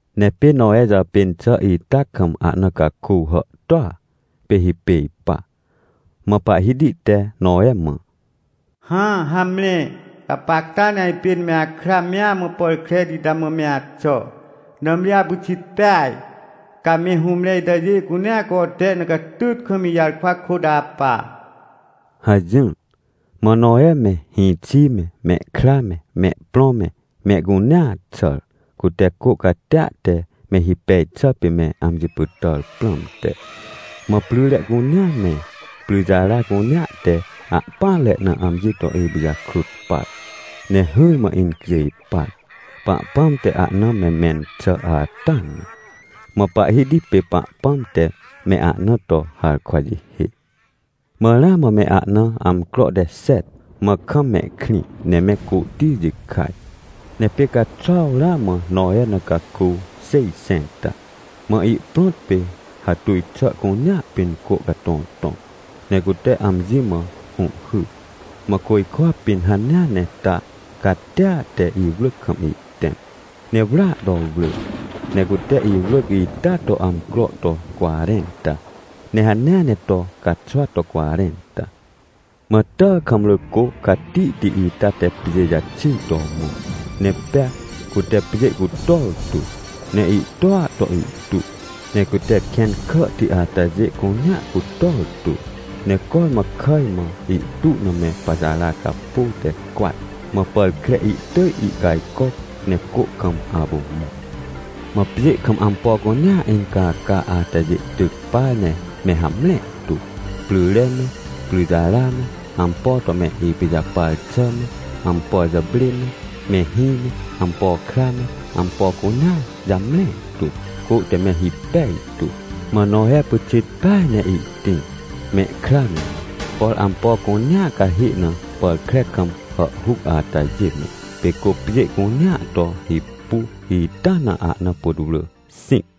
Ne pê Nowe jàpên xà ita kam ahna caku hàhtôa, pê hipêj pa. Mã Pahhiti te Nowe mã: — Hã, hamre, gapacta ne ajpên me akra mea mã pàr kreti ita mã me axà. Nãmri apyxit peaj, ca me hũmre itajê cunea cote na catyt kam ijarkwa kôt apa — hajỹr. Mã Nowe me, hĩxi me, mehkra me, mehprõ me, mehcunea xàr, cute cô catia te me hipej xà pê me amji pytàr prãmte. Mã pryre cunea me, pryjara cunea te ahpỹanre na amji to ipijakrut par, ne hỹrmã incjêj par, Pahpãm te ahna me mẽn xà ata na. Mã Pahhiti pê Pahpãm te me ahna to harkwa jihê. Mã ramã me ahna amcro te xet, mã kam mehkrĩ ne me côhti jikaj. Ne pê caxuaw ramã Nowe na caku xêjxẽnta. Mã ihprõt pê hatuj xà cunea pĩn cô catõtõc, ne cute amji mã hũhhyr, mã côjkwa pĩn hanea ne ta catia te iwrỳc kam ihtẽm. Ne wrỳa to wrỳ, ne cute iwrỳc ita to amcro to cwarẽnta, ne hanea ne to caxwa to cwarẽnta. Mã tàkamrỳ cô catihti ita te pjê jaxir to mõ, ne pea cute pjê cutor tu. Ne ihtua to ihtu, ne cute kẽn kàhti atajê cunea cutor tu, ne cormã kàj mã ihtu na me pajara capô te cwat. Mã pàr kre ihtỳj ihcajcoc, ne cô kam apu mõ. Mã pjê kam ampo cunea incaca atajê tyc par ne me hamre tu. Pryre me, pryjara me, ampo to me ipijapar xà me, ampo jàprê me, mehĩ me, ampo kra me, ampo cunea jamre tu. Cô te me hipej tu. Mã Nowe pyxit peaj ne ihtĩr, mehkra me, por ampo cunea cahê na pàr kre kam hàhhuc atajê me. Pê cô pjê cunea to hipu ita na ahna putwrỳ xĩc.